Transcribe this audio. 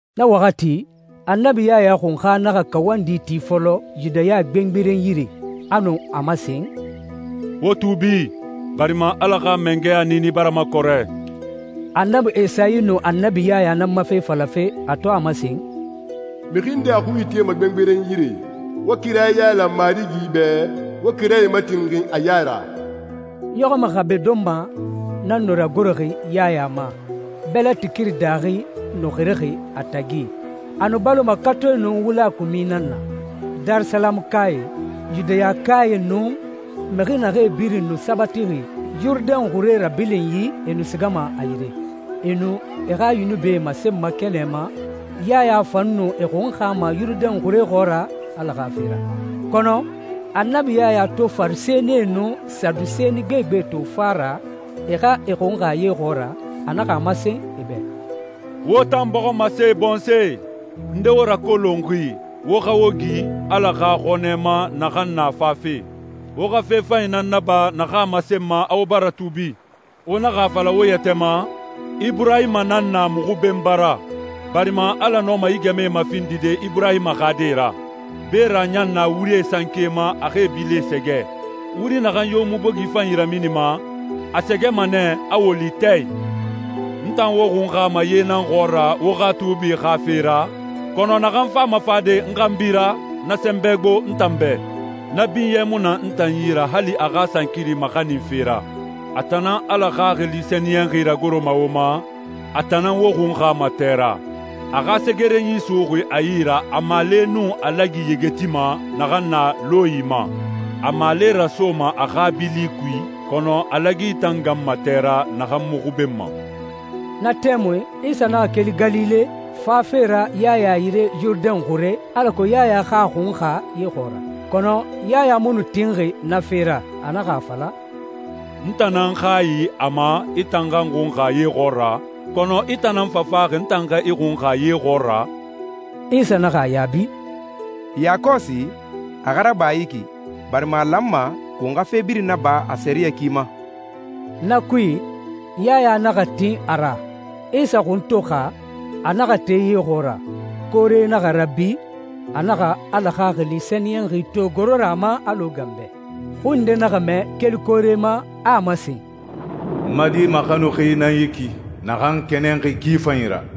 Na waxati Annabi Yaya Xunxa naxa kawandi ti fɔlɔ Yudaya gbengberen yire. A nu a masen, «Wo tuubi, barima Ala xa mangɛya niini bara makɔrɛ.» Annabi Esayi nu Annabi Yaya nan ma fe falafe, a to a masen, «Mixi nde a xui itema gbengberen yire, ‹Wo kira yailan Marigi bɛ, wo kirae matinxin a ya ra.›» Ɲɔxɔmɛ xabe donma nan nu ragoroxi Yaya ma, bɛlɛti kiri daaxi nu xirixi a tagi. A nu baloma katoe nun wula kumi nan na. Darisalamukae, Yudayakae, nun mixi naxee birin nu sabatixi Yurudɛn xure rabilinyi, e nu sigama a yire. E nu e xa yunubie masenma kɛnɛ ma, Yaya fan nu e xunxama Yurudɛn xure xɔɔra Ala xa fe ra. Kɔnɔ Annabi Yaya to Farisɛnie nun Saduseni gbegbe to fa ra e xa e xunxa ye xɔɔra, a naxa a masen e bɛ, «Wo tan bɔximase bɔnsɔɛ! Nde wo rakolonxi wo xa wo gi Ala xa xɔnɛ ma naxan na fafe? Wo xa fe fanyi nan naba naxan a masenma a wo bara tuubi. Wo naxa a fala wo yɛtɛ ma, ‹Iburahima nan na muxu benba ra,› barima Ala nɔma yi gɛmɛe mafindide Iburahima xa die ra. Beera ɲan na wurie sanke ma a xa e bilie sɛgɛ. Wuri naxan yo mu bogi fanyi raminima, a sɛgɛma nɛ, a woli tɛ i. N tan wo xunxama ye nan xɔɔra wo xa tuubi xa fe ra, kɔnɔ naxan fama fade n xanbi ra, na sɛnbɛ gbo n tan bɛ. Na binyɛ mu na n tan yi ra hali a xa sankiri maxaninfe ra. A tan nan Ala Xaxili Sɛniyɛnxi ragoroma wo ma, a tan nan wo xunxama tɛ ra. A xa segerenyi suxuxi a yi ra, a maale nun a lagi yegetima naxan na lɔnyi ma. A maale rasoma a xa bili kui, kɔnɔ a lagi tan ganma tɛ ra naxan mu xubenma.» Na tɛmui Isa naxa keli Galile, fafe ra Yaya yire Yurudɛn xure, alako Yaya xa a xunxa ye xɔɔra. Kɔnɔ Yaya mu nu tinxi na fe ra. A naxa a fala, «N tan nan hayi a ma i tan xa n xunxa ye xɔɔra, kɔnɔ i tan nan fa faxi n tan xa i xunxa ye xɔɔra?» Isa naxa a yaabi, «Yakɔsi, a xa raba yi ki, barima a lanma won xa fe birin naba a sɛriyɛ ki ma.» Na kui, Yaya naxa tin a ra. Isa xun to xa, a naxa te ye xɔɔra, koore naxa rabi, a naxa Ala Xaxili Sɛniyɛnxi to goro ra a ma alɔ ganbɛ. Xui nde naxa mɛ keli koore ma, a a masen, «N ma Di maxanuxi nan yi ki naxan n kɛnɛnxi ki fanyi ra.»